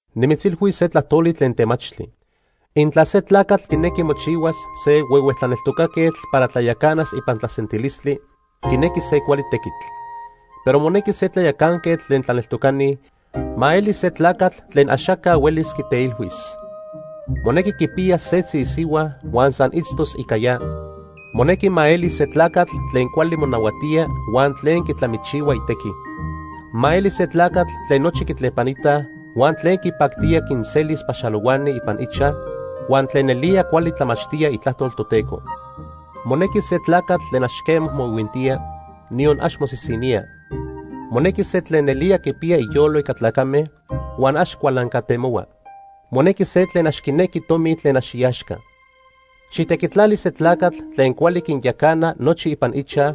Nimitzilhuis se tlajtoli tlen temachtli. Intla se tlacatl quinequi mochihuas se huehue tlaneltocaquetl para tlayacanas ipan tlasentilistli, quinequi se cuali tequitl. Pero monequi se tlayacanquetl tlen tlaneltocani ma eli se tlacatl tlen axaca huelis quiteilhuis. Monequi quipiyas setzi isihua huan san itztos ica ya. Monequi ma eli se tlacatl tlen cuali monahuatía huan tlen quitlamichihua itequi. Ma eli se tlacatl tlen nochi quitlepanitaj, huan tlen quipactía quinselis paxalohuani ipan ichaj, huan tlen nelía cuali tlamachtía itlajtol Toteco. Monequi se tlacatl tlen ax quema moihuintía, niyon ax mosisinía. Monequi se tlen nelía quipiya iyolo ica tlacame, huan ax cualancatemohua. Monequi se tlen ax quinequi tomi tlen ax iaxca. Xijtequitlali se tlacatl tlen cuali quinyacana nochi ipan ichaj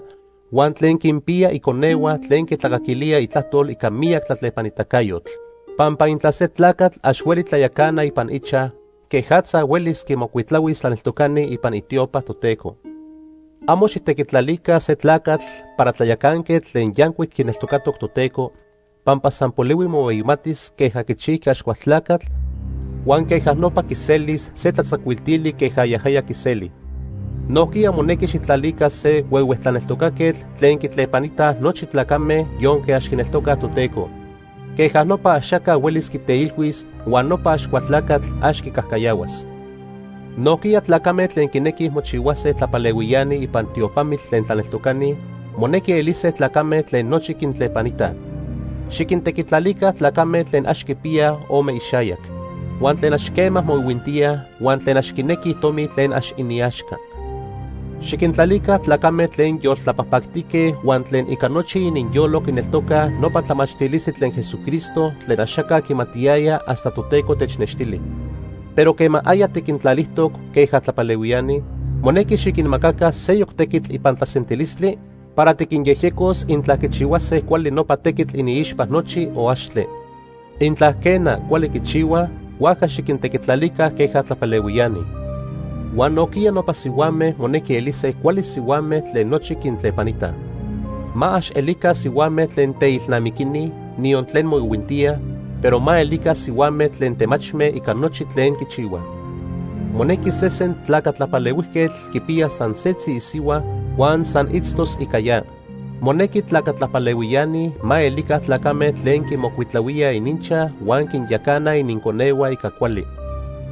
huan tlen quinpiya iconehua tlen quitlacaquilíaj itlajtol ica miyac tlatlepanitacayotl. Pampa intla se tlacatl ax hueli tlayacana ipan ichaj, quejatza huelis quimocuitlahuis tlaneltocani ipan itiopa Toteco. Amo xijtequitlalica se tlacatl para tlayacanquetl tlen yancuic quineltocatoc Toteco, pampa san polihui mohueyimatis queja quichijqui Axcualtlacatl huan queja nopa quiselis se tlatzacuiltili queja yajaya quiseli. Nojquiya monequi xijtlalica se huehue tlaneltocaquetl tlen quitlepanitaj nochi tlacame yonque ax quineltocaj Toteco. Queja nopa axaca huelis quiteilhuis huan nopa Axcualtlacatl ax quicajcayahuas. Nojquiya tlacame tlen quinequij mochihuase tlapalehuiani ipan tiopamitl tlen tlaneltocani monequi elise tlacame tlen nochi quintlepanitaj. Xiquintequitlalica tlacame tlen ax quipiya ome ixayac, huan tlen ax quema moihuintíaj, huan tlen ax quinequij tomi tlen ax iniaxca. Xiquintlalica tlacame tlen yoltlapajpactique huan tlen ica nochi ininyolo quineltocaj nopa tlamachtilistli tlen Jesucristo tlen axaca quimatiyaya hasta Toteco technextili. Pero quema aya tiquintlalijtoc queja tlapalehuiani, monequi xiquinmacaca seyoc tequitl ipan tlasentilistli para tiquinyejyecos intla quichihuase cuali nopa tequitl iniixpa nochi, o axtle. Intla, quena, cuali quichihuaj, huajca xiquintequitlalica queja tlapalehuiani. Huan nojquiya nopa sihuame monequi elise cuali sihuame tlen nochi quintlepanitaj. Ma ax elica sihuame tlen teilnamiquini, niyon tlen moihuintíaj, pero ma elica sihuame tlen temachme ica nochi tlen quichihuaj. Monequi sesen tlaca tlapalehuijquetl quipiyas san setzi isihua huan san itztos ica ya. Monequi tlaca tlapalehuiani ma elica tlacame tlen quimocuitlahuíaj ininchaj huan quinyacanaj ininconehua ica cuali.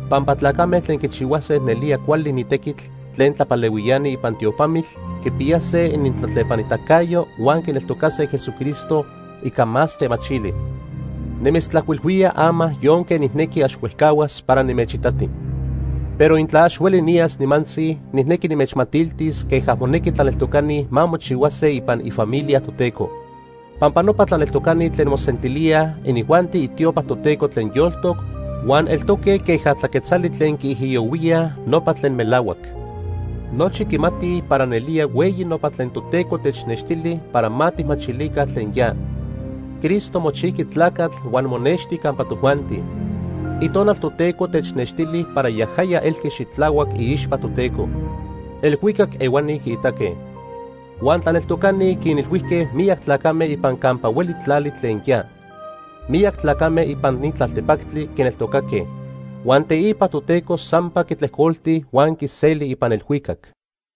Pampa tlacame tlen quichihuase nelía cuali ni tequitl tlen tlapalehuiani ipan tiopamitl quipiyase inintlatlepanitacayo huan quineltocase Jesucristo ica más temachili. Nimitztlajcuilhuía ama yonque nijnequi ax huejcahuas para nimechitati. Pero intla ax hueli niyas nimantzi, nijnequi nimechmatiltis queja monequi tlaneltocani ma mochihuase ipan ifamilia Toteco. Pampa nopa tlaneltocani tlen mosentilíaj, inijuanti itiopa Toteco tlen yoltoc huan eltoque queja tlaquetzali tlen quiijiyohuíaj nopa tlen melahuac. Nochi quimatij para nelía hueyi nopa tlen Toteco technextili para ma tijmachilica tlen ya: Cristo mochijqui tlacatl huan monexti campa tojuanti. Itonal Toteco technextili para yajaya elqui xitlahuac iixpa Toteco. Elhuicac ehuani quiitaque. Huan tlaneltocani quinilhuijque miyac tlacame ipan campa hueli tlali tlen ya. Miyac tlacame ipan ni tlaltepactli quineltocaque. Huan teipa Toteco sampa quitlejcolti huan quiseli ipan elhuicac.